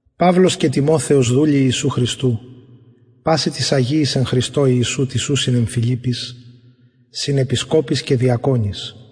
παυλος και τιμοθεος δουλοι ιησου χριστου πασιν τοις αγιοις εν χριστω ιησου τοις ουσιν εν φιλιπποις συν επισκοποις και διακονοις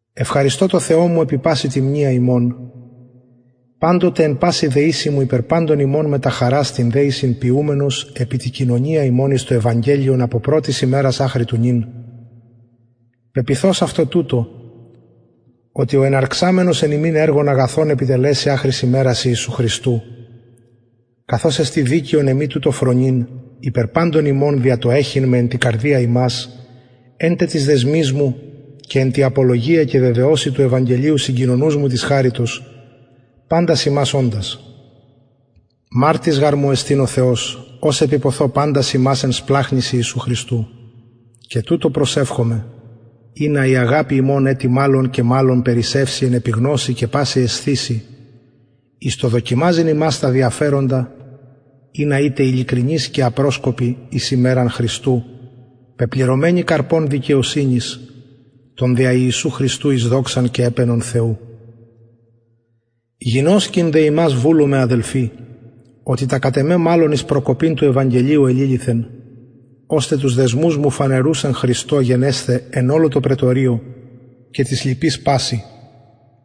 ευχαριστω τω θεω μου επι παση τη μνεια υμων παντοτε εν παση δεησει μου υπερ παντων υμων μετα χαρας την δεησιν ποιουμενος επι τη κοινωνια υμων εις το ευαγγελιον απο πρωτης ημερας αχρι του νυν πεποιθως αυτο τουτο οτι ο εναρξαμενος εν υμιν εργον αγαθον επιτελεσει αχρι ημερας χριστου ιησου καθως εστιν δικαιον εμοι τουτο φρονειν υπερ παντων υμων δια το εχειν με εν τη καρδια υμας εν τε τοις δεσμοις μου και εν τη απολογια και βεβαιωσει του ευαγγελιου συγκοινωνους μου της χαριτος παντας υμας οντας μαρτυς γαρ μου εστιν ο θεος ως επιποθω παντας υμας εν σπλαγχνοις ιησου χριστου και τουτο προσευχομαι ινα η αγαπη υμων ετι μαλλον και μαλλον περισσευη εν επιγνωσει και παση αισθησει εις το δοκιμαζειν υμας τα διαφεροντα ινα ητε ειλικρινεις και απροσκοποι εις ημεραν χριστου πεπληρωμενοι καρπων δικαιοσυνης των δια ιησου χριστου εις δοξαν και επαινον θεου γινωσκειν δε υμας βουλομαι αδελφοι οτι τα κατ εμε μαλλον εις προκοπην του ευαγγελιου εληλυθεν ωστε τους δεσμους μου φανερους εν χριστω γενεσθαι εν ολω τω πραιτωριω και τοις λοιποις πασιν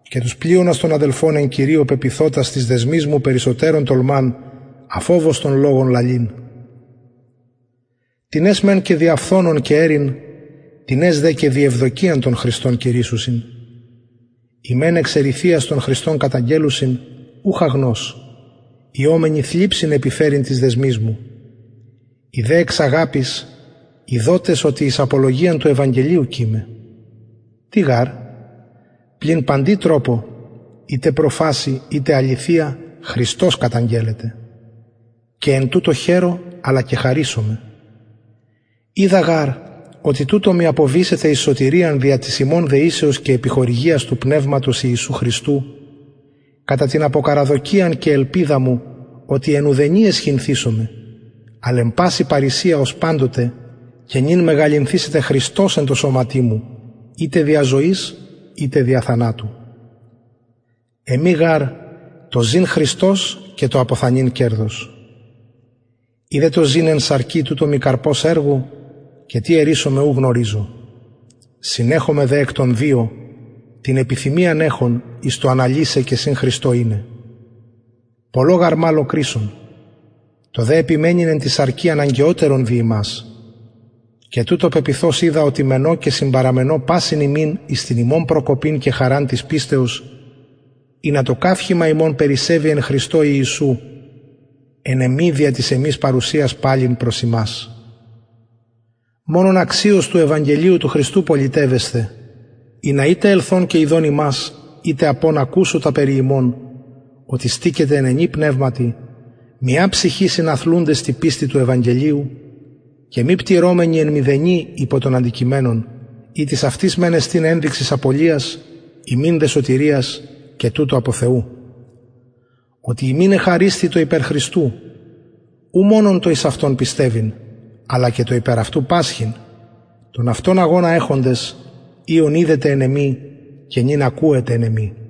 και τους πλειονας των αδελφων εν κυριω πεποιθοτας τοις δεσμοις μου περισσοτερως τολμαν αφοβως τον λογον λαλειν τινες μεν και δια φθονον και εριν τινες δε και δι ευδοκιαν τον χριστον κηρυσσουσιν οι μεν εξ εριθειας τον χριστον καταγγελλουσιν ουχ αγνως οιομενοι θλιψιν επιφερειν τοις δεσμοις μου οι δε εξ αγαπης ειδοτες οτι εις απολογιαν του ευαγγελιου κειμαι τι γαρ πλην παντι τροπω ειτε προφασει ειτε αληθεια χριστος καταγγελλεται και εν τουτω χαιρω αλλα και χαρησομαι οιδα γαρ οτι τουτο μοι αποβησεται εις σωτηριαν δια της υμων δεησεως και επιχορηγιας του πνευματος ιησου χριστου κατα την αποκαραδοκιαν και ελπιδα μου οτι εν ουδενι αισχυνθησομαι αλλ εν παση παρρησια ως παντοτε και νυν μεγαλυνθησεται χριστος εν τω σωματι μου ειτε δια ζωης ειτε δια θανατου εμοι γαρ το ζην χριστος και το αποθανειν κερδος ει δε το ζην εν σαρκι τουτο μοι καρπος εργου και τι αιρησομαι ου γνωριζω συνεχομαι δε εκ των δυο την επιθυμιαν εχων εις το αναλυσαι και συν χριστω ειναι πολλω μαλλον κρεισσον το δε επιμενειν εν τη σαρκι αναγκαιοτερον δι υμας και τουτο πεποιθως οιδα οτι μενω και συμπαραμενω πασιν υμιν εις την υμων προκοπην και χαραν της πιστεως ινα το καυχημα υμων περισσευη εν χριστω ιησου εν εμοι δια της εμης παρουσιας παλιν προς υμας μονον αξιως του ευαγγελιου του χριστου πολιτευεσθε ινα ειτε ελθων και ιδων υμας ειτε απων ακουσω τα περι υμων οτι στηκετε εν ενι πνευματι μια ψυχη συναθλουντες τη πιστει του ευαγγελιου και μη πτυρομενοι εν μηδενι υπο των αντικειμενων ητις αυτοις μεν εστιν ενδειξις απωλειας υμιν δε σωτηριας και τουτο απο θεου οτι υμιν εχαρισθη το υπερ χριστου ου μονον το εις αυτον πιστευειν αλλα και το υπερ αυτου πασχειν τον αυτον αγωνα εχοντες οιον ειδετε εν εμοι και νυν ακουετε εν εμοι